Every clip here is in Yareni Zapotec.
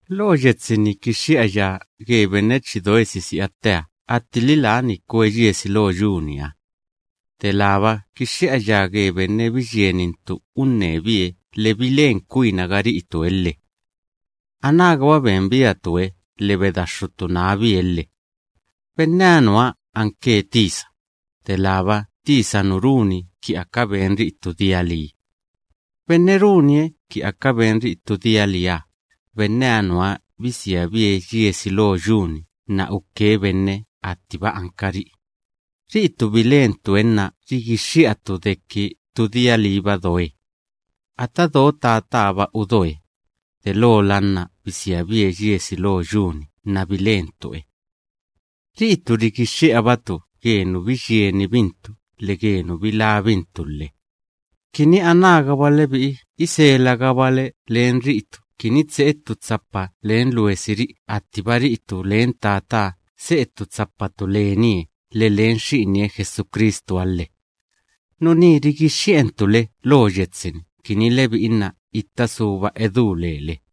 Lo yetsi‑ni rigixxi'aya ge benne chi doe sisi'a tteha attili lani kwe yiesi lo yu‑niha; delába kixxi'aya ge benne biyienintu unnebie lhe bilen kwinaga ri'itue lhe. Anágaba benbiatue lhe bedaxxutu nábie lhe. Benneha nuha anke tisa, delába tisa nu runi ki aka benri'i ttu dia lii. Benne runie ki aka benri'i ttu dia liiha, benneha nuha bisiabie yiesi lo yu‑ni nna uke benne attiba ankari'i. Ri'itu bilentue nna rigixxi'atu deki ttu dia liiba doe. Ata do Tataha‑ba udoe, delola nna bisiabie yiesi lo yu‑ni nna bilentue. Ri'itu rigixxi'abatu ge nu biyienibintu lhe ge nu bilábintu lhe, kini anágaba lebi'i iselagabale len ri'itu kini tse'e ttu tsapa len luesiri'i attiba ri'itu len Tataha se'e ttu tsapatu lenie lhe len Xi'inie Jesucristuha lhe. Nuní rigixxi'entu le lo yetsi‑ni kini lebi'i nna itta suba edú lele.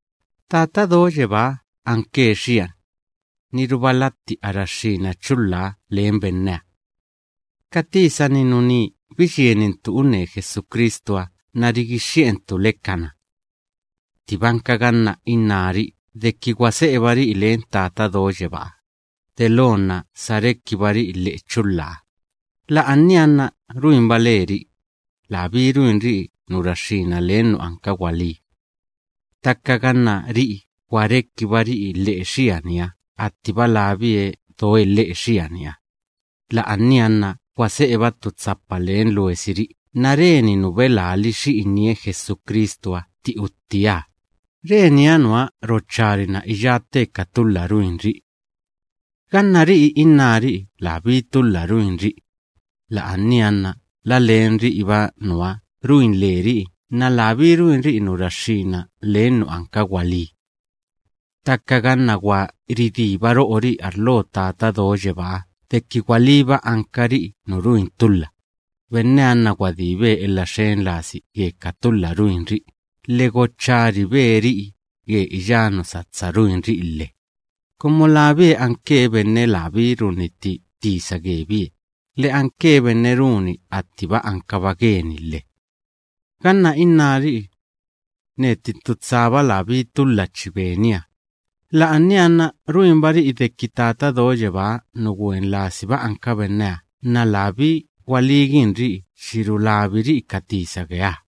Tata Do Yebáha anke xiani. Niruba latti a raxxína chulhaha len benneha. Ka tisa‑ni nuní biyienintu unne Jesucristuha nna rigixxi'entu le kana. Ttibanka ganna innári'i deki gwa se'ebari'i len Tata Do Yebáha, delo nna sa rekibari'i lhe'e chulhaha, la'ania nna ruinba leri'i; labí ruinri'i nu raxxína len nu anka gwalí. Ttaka ganna ri'i gwa rekibari'i lhe'e xianiha attiba labie doe lhe'e xianiha, la'ania nna gwa se'eba ttu tsapa len luesiri'i, nna reni nu belali Xi'inie Jesucristuha tti uttieha, reniha nuha rocharina iyá tte ka tulha ruinri'i. Ganna ri'i innári'i labí tulha ruinri'i, la'ania nna la len ri'iba nuha ruin leri'i nna labí ruinri'i nu raxxína len nu anka gwalí. Ttaka ganna gwa ridíba ro'ori'i arlo Tata Do Yebáha deki gwalíba ankari'i nu ruin tulha, benneha nna gwadíbe elha xen lasi ge ka tulha ruinri'i lhe gocharibe ri'i ge iyá nu satsa ruinri'i lhe, kumu labie anke benne labí runnitti tisa gebie lhe anke benne runi attiba ankaba geni lhe. Ganna innári'i: “Neti ttu tsaba labí tulha chi benia”, la'ania nna ruinbari'i deki Tata Do Yebáha nu gwen lasiba anka benneha nna labí gwalíginri'i chi rulabiri'i ka tisa geeha.